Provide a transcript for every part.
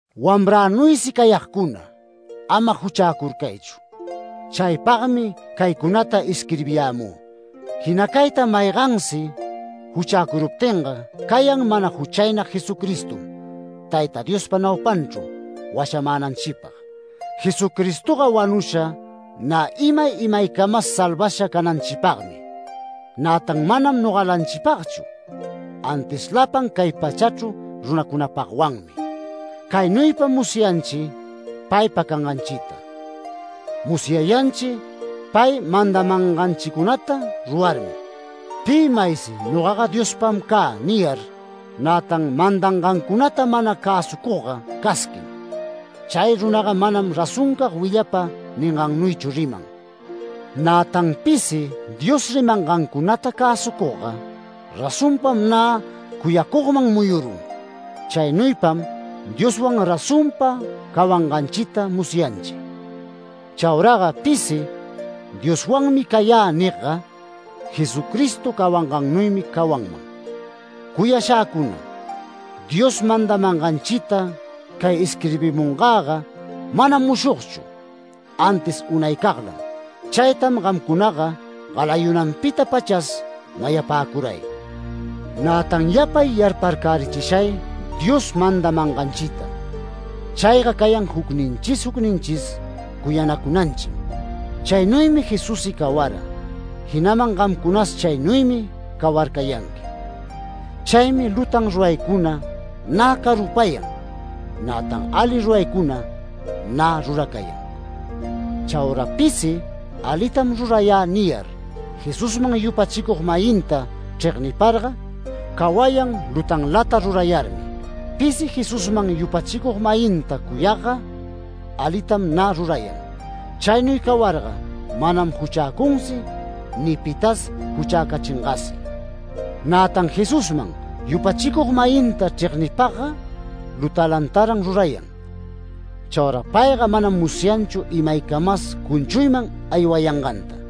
Wamränuysi cayagcuna, ama juchäcurcaychu. Chaypagmi caycunata isquirbiyämü. Jinacayta maygansi juchäcuruptinga cayan mana juchaynag Jesucristom Tayta Diospa naupanchru washamänanchipag. Jesucristoga wanusha nä imay imaycamas salvasha cananchipagmi, nätan manam nogalanchipagchu, antis lapan cay pachachru runacunapagwanmi. Caynuypam musyanchi paypa canganchita; musyayanchi pay mandamanganchicunata rurarmi. Pi maysi “Nogaga Diospam cä” niyar, nätan mandangancunata mana cäsucugga casquim. Chay runaga manam razoncag willapa ningannuychu riman. Nätan pisi Dios rimangancunata cäsucugga, razonpam nä cuyacugman muyurun. Chaynuypam Dioswan razonpa cawanganchita musyanchi. Chauraga pisi “Dioswanmi cayä” nigga, Jesucristo cawangannuymi cawanman. Cuyashäcuna, Dios mandamanganchita cay isquirbimungäga manam mushogchu, antis unaycaglam. Chaytam gamcunaga galayunanpita-pachas mayapäcuray. Nätan yapay yarparcärichishay Dios mandamanganchita. Chayga cayan jucninchis jucninchis cuyanacunanchim. Chaynuymi Jesussi cawara, jinaman gamcunas chaynuymi cawarcayanqui. Chaymi lutan ruraycuna nä carupayan, nätan ali ruraycuna nä ruracayan. Chaura pisi “Alitam rurayä” niyar, Jesusman yupachicug-mayinta chregniparga, cawayan lutanlata rurayarmi. Pisi Jesusman yupachicug-mayinta cuyagga, alitam nä rurayan. Chaynuy cawarga manam juchäcunsi ni pitas juchäcachingasi. Nätan Jesusman yupachicug-mayinta chregniypagga, lutanlataran rurayan. Chaura payga manam musyanchu imaycamas cunchuyman aywayanganta.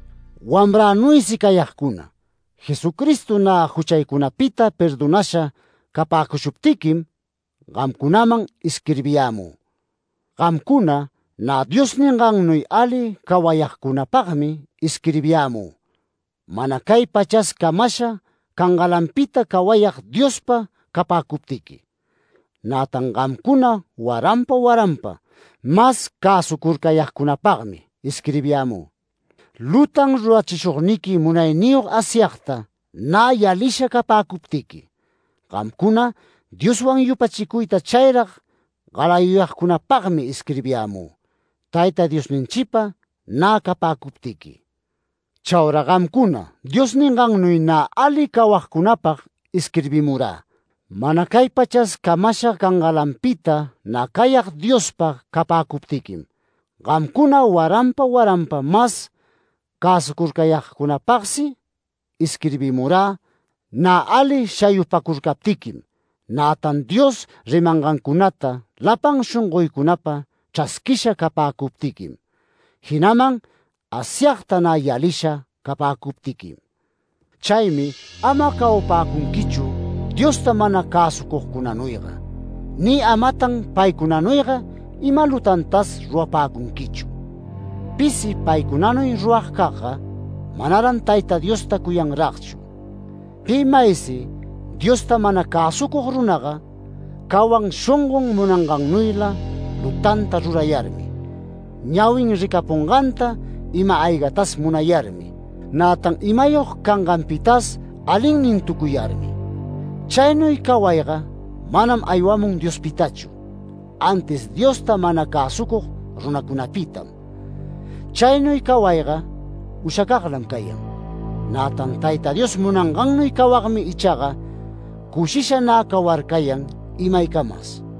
Wamränuysi cayagcuna, Jesucristo nä juchaycunapita perdonasha capäcushuptiquim gamcunaman isquirbiyämü. Gamcuna nä Dios ningannuy ali cawayagcunapagmi isquirbiyämü, mana cay pachas camasha cangalanpita cawayag Diospa capäcuptiqui. Nätan gamcuna waranpa waranpa mas cäsucurcayagcunapagmi isquirbiyämü, lutan rurachishugniqui munayniyog Asyagta nä yalisha capäcuptiqui. Gamcuna Dioswan yupachicuyta chayrag galayuyagcunapagmi isquirbiyämü, Tayta Diosninchipa nä capäcuptiqui. Chaura gamcuna Dios ningannuy nä ali cawagcunapag isquirbimurä, mana cay pachas camasha cangalanpita nä cayag Diospa capäcuptiquim. Gamcuna waranpa waranpa mas cäsucurcayagcunapagsi isquirbimurä, nä ali shayupacurcaptiquim, nätan Dios rimangancunata lapan shongoycunapa chrasquisha capäcuptiquim, jinaman Asyagta nä yalisha capäcuptiquim. Chaymi ama cawapäcunquichu Diosta mana cäsucugcunanuyga, ni amatan paycunanuyga ima lutantas rurapäcunquichu. Pisi paycunanuy ruragcagga, manaran Tayta Diosta cuyanragchu. Pi maysi Diosta mana cäsucug runaga cawan shongon munangannuyla lutanta rurayarmi, ñawin ricapunganta ima-aygatas munayarmi, nätan imayog canganpitas alinnintucuyarmi. Chaynuy cawayga manam aywamun Diospitachu, antis Diosta mana cäsucug runacunapitam. Chaynuy cawayga ushacaglam cayan, nätan Tayta Dios munangannuy cawagmi ichaga cushisha nä cawarcayan imaycamas.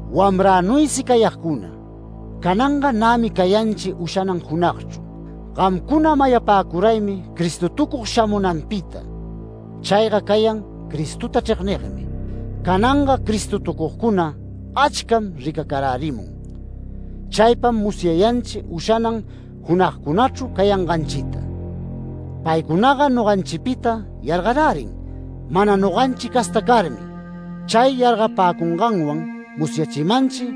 Wamränuysi cayagcuna, cananga nämi cayanchi ushanan junagchru. Gamcuna mayapäcuraymi Cristotucug shamunanpita. Chayga cayan Cristota chregnigmi. Cananga Cristotucugcuna achcam ricacarärimun. Chaypam musyayanchi ushanan junagcunachru cayanganchita. Paycunaga noganchipita yargarärin mana noganchi casta carmi. Chay yargapäcunganwan musyachimanchi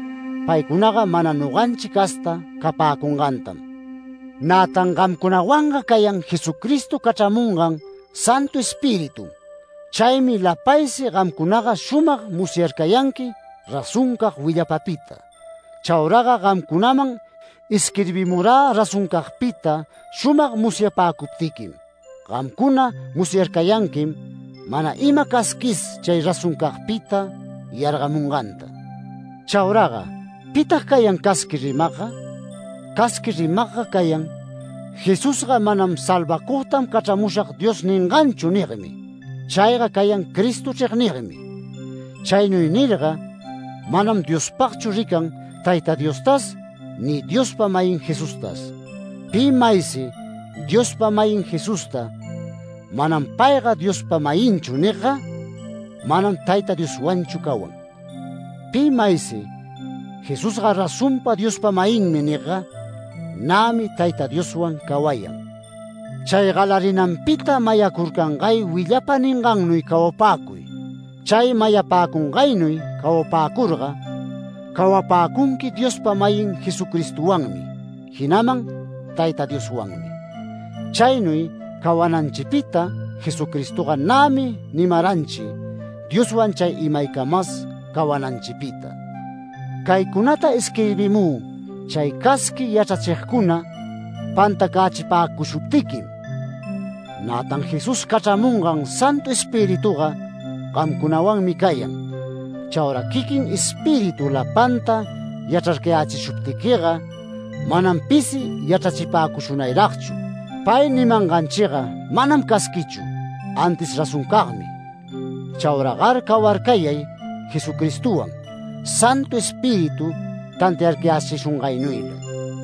paycunaga mana noganchi casta capäcungantam. Nätan gamcunawanga cayan Jesucristo cachramungan Santu Espiritum. Chaymi lapaysi gamcunaga shumag musyarcayanqui razoncag willapapita. Chauraga gamcunaman isquirbimurä razoncagpita shumag musyapäcuptiquim. Gamcuna musyarcayanquim, mana ima casquis chay razoncagpita yargamunganta. Chauraga ¿pitag cayan casqui rimagga? Casqui rimagga cayan “Jesusga manam ‘Salvacugtam cachramushag’ Dios ninganchu” nigmi. Chayga cayan Cristo chregnigmi, chaynuy nirga manam Diospagchu rican, Tayta Diostas ni Diospa-mayin Jesustas. Pi maysi Diospa-mayin Jesusta “Manam payga Diospa-mayinchu” nigga, manam Tayta Dioswanchu cawan. Pi maysi “Jesusga razonpa Diospa-mayinmi” nigga, nämi Tayta Dioswan cawayan. Chay galarinanpita mayacurcangay willapa ningannuy cawapäcuy. Chay mayapäcungaynuy cawapäcurga, cawapäcunqui Diospa-mayin Jesucristowanmi, jinaman Tayta Dioswanmi. Chaynuy cawananchipita Jesucristoga nämi nimaranchi Dioswan chay imaycamas cawananchipita. Caycunata isquirbimü chay casqui yachrachigcuna pantacächipäcushuptiquim. Nätan Jesús cachramungan Santu Espirituga gamcunawanmi cayan. Chaura quiquin Espíritu lapanta yachrarcayächishuptiquiga, manam pisi yachrachipäcushunayragchu. Pay nimanganchiga manam casquichu, antis razoncagmi. Chauragar cawarcayay Jesucristowan, Santu Espíritu tantiarcayächishungaynuyla.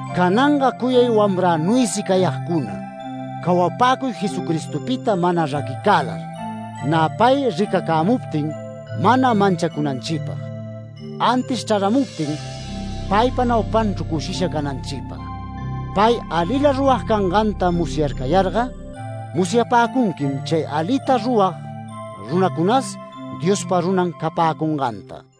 Cananga cuyay wamränuysi cayagcuna, cawapäcuy Jesucristopita mana raquicälar, nä pay ricacämuptin mana manchacunanchipag, antis chraramuptin paypa naupanchru cushisha cananchipag. Pay alila rurag canganta musyarcayarga, musyapäcunquim chay alita rurag runacunas, Diospa runan capäcunganta.